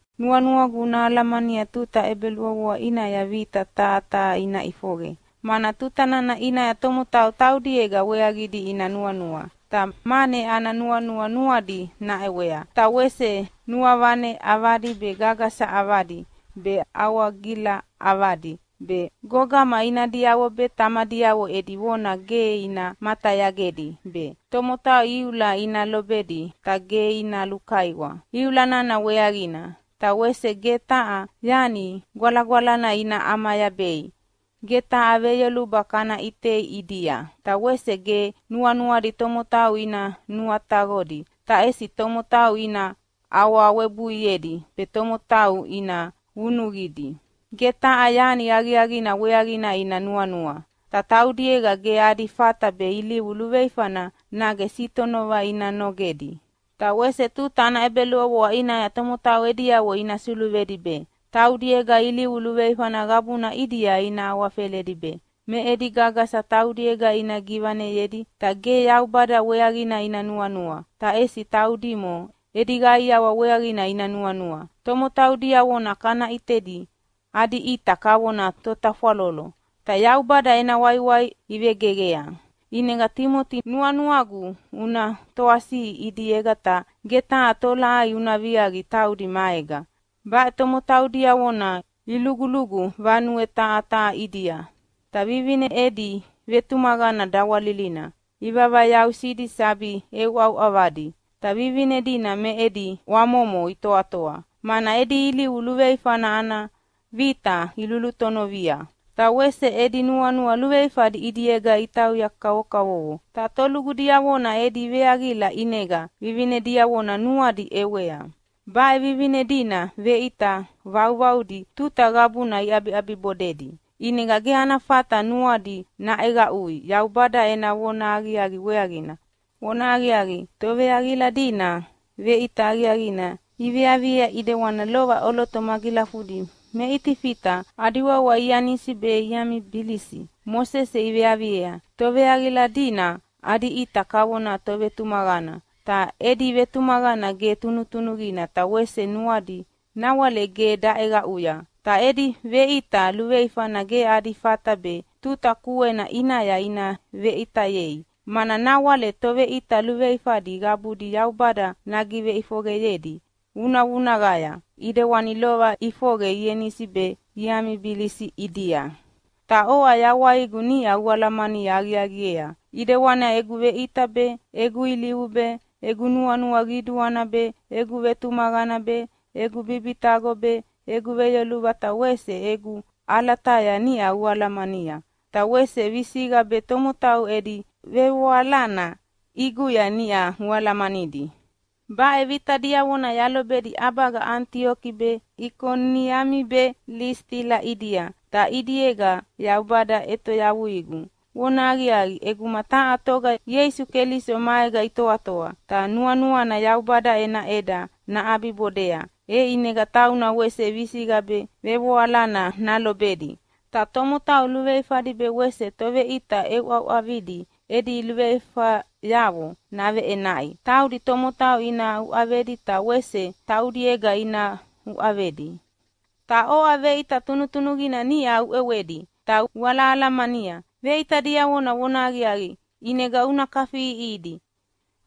Nuanuagu una alamania tuta ʼebeluʼovoa ʼinaya vita taha taha ina ʼifoqe. Mana tuta nana ʼinaya tomotau taudiega weaqidi ina nuanua, ta mane ana nuanua nuadi naʼewea. Ta wese nuavane ʼavadi be, gagasa ʼavadi be, awagila ʼavadi be, gogama inadiavo be tamadiavo edi vona ge ina matayagedi be, tomotau iula ina lobedi ta ge ina lukaiwa iula nana weaqina, ta wese ge taha yani gwalagwalana ina ʼamayabei. Ge taha veyoluba kana ʼitei ʼidia, ta wese ge nuanuadi tomotau ina nuataqodi, ta ʼesi tomotau ina awawebuiedi be tomotau ina vunuqidi. Ge taha yani aqiaqina weaqina ina nuanua, ta taudiega ge adi fata be ilivu luveifana nage sitonova ina nogedi. Ta wese tuta ʼebeluʼovoa ʼinaya tomotau ediavo ina suluvedi be, taudiega ilivu luveifana qabuna ʼidia ina awafeledi be, me edi gagasa taudiega ina givaneyedi. Ta ge Yaubada weaqina ina nuanua, ta ʼesi taudimo edi qaiawa weaqina ina nuanua. Tomotau diavona kana ʼitedi adi ʼita kavona totafwalolo, ta Yaubada ena waiwai ivegeqea. ʼInega Timoti nuanuagu una toasiʼi ʼidiega ta ge taha tolaʼai una viaqi taudi maega. Baʼe tomotau diavona ilugulugu vanue taha taha ʼidia, ta vivine edi vetumaqana dawalilina ivavayausidi sabi ʼeuʼauʼavadi. Ta vivine dina me edi ʼwamomo itoatoa, mana edi ilivu luveifana ana vita ilulutonovia, ta wese edi nuanua luveifadi ʼidiega itauya kavokavovo. Ta tolugu diavona edi veaqila ʼinega vivine diavona nuadi iʼewea. Baʼe vivine dina veʼita vauvaudi tuta qabuna iʼabiʼabibodedi, ʼinega ge ana fata nuadi naʼeqaʼui Yaubada ena vonahaqiaqi weaqina. Vonahaqiaqi, toveaqila dina veʼita aqiaqina iveaviea ʼidewani lova ʼoloto magilafudi me Itifita adi wawa Ianisi be Iamibilisi Mosese iveaviea. Toveaqila dina adi ʼita kavona tovetumaqana, ta edi vetumaqana ge tunutunuqina ta wese nuadi nawale ge daʼeqaʼuya. Ta edi veʼita luveifana ge adi fata be tuta kuena ʼinaya ina veʼitayei, mana nawale toveʼita luveifadi qabudi Yaubada nagiveʼifoqeyedi vunavunaqaya, ʼidewani lova ʼifoqe Ianisi be Iamibilisi ʼidia. Ta oʼa yawaigu niʼa ualamani aqiaqiea, ʼidewani egu veʼita be, egu ilivu be, egu nuanua qiduana be, egu vetumaqana be, egu bibitaqo be, egu veyoluba ta wese egu ʼalataya niʼa ualamania. Ta wese visiqa be tomotau edi vevoalana ʼiguya niʼa ualamanidi. Baʼe vita diavona yalobedi ʼabaga Anitioki be Ikoniami be Lisitila ʼidia, ta ʼidiega Yaubada ʼetoyavuigu. Vonahaqiaqi, ʼeguma taha toga Ieisu Keliso maega itoatoa, ta nuanuana Yaubada ena ʼeda naʼabibodea, e ʼinega tauna wese visiqa be vevoalana nalobedi. Ta tomotau luveifadi be wese toveʼita ʼeuʼauʼavidi edi luveifayavo naveʼenaʼi. Taudi tomotau ina uʼavedi, ta wese taudiega ina uʼavedi. Ta oʼa veʼita tunutunuqina niʼa uʼewedi ta ualahalamania veʼita diavona vonahaqiaqi. ʼInega una kafiʼiʼihidi,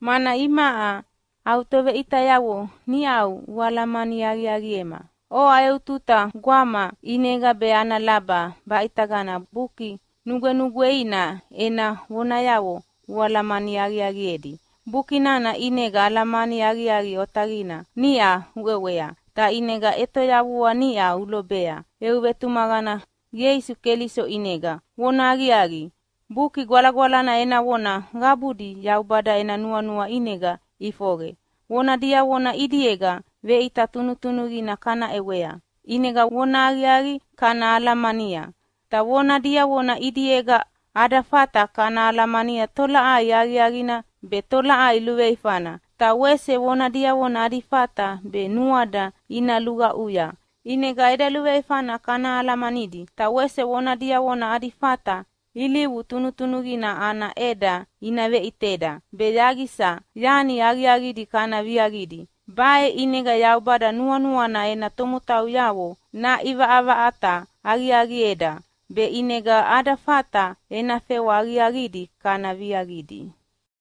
mana imaʼa au toveʼitayavo niʼau ualamani aqiaqiema. Oʼa eu tuta gwama ʼinega be ana laba baʼitagana Buki Nugwenugweina ena vonayavo ualamani aqiaqiedi. Buki nana ʼinega alamani aqiaqi otaqina niʼa uʼewea, ta ʼinega ʼetoyavua niʼa ulobea eu vetumaqana Ieisu Keliso ʼinega. Vonahaqiaqi, Buki Gwalagwalana ena vona qabudi Yaubada ena nuanua ʼinega iʼifoqe. Vona diavona ʼidiega veʼita tunutunuqina kana ʼewea, ʼinega vonahaqiaqi kana alamania. Ta vona diavona ʼidiega ada fata kana alamania tolaʼai aqiaqina be tolaʼai luveifana. Ta wese vona diavona adi fata be nuada ina luqaʼuya ʼinega eda luveifana kana alamanidi. Ta wese vona diavona adi fata ilivu tunutunuqina ana ʼeda ina veʼiteda, be yaqisa yani aqiaqidi kana viaqidi. Baʼe ʼinega Yaubada nuanuana ena tomotauyavo naʼivaʼavaʼata aqiaqieda, be ʼinega ada fata ena fewa aqiaqidi kana viaqidi.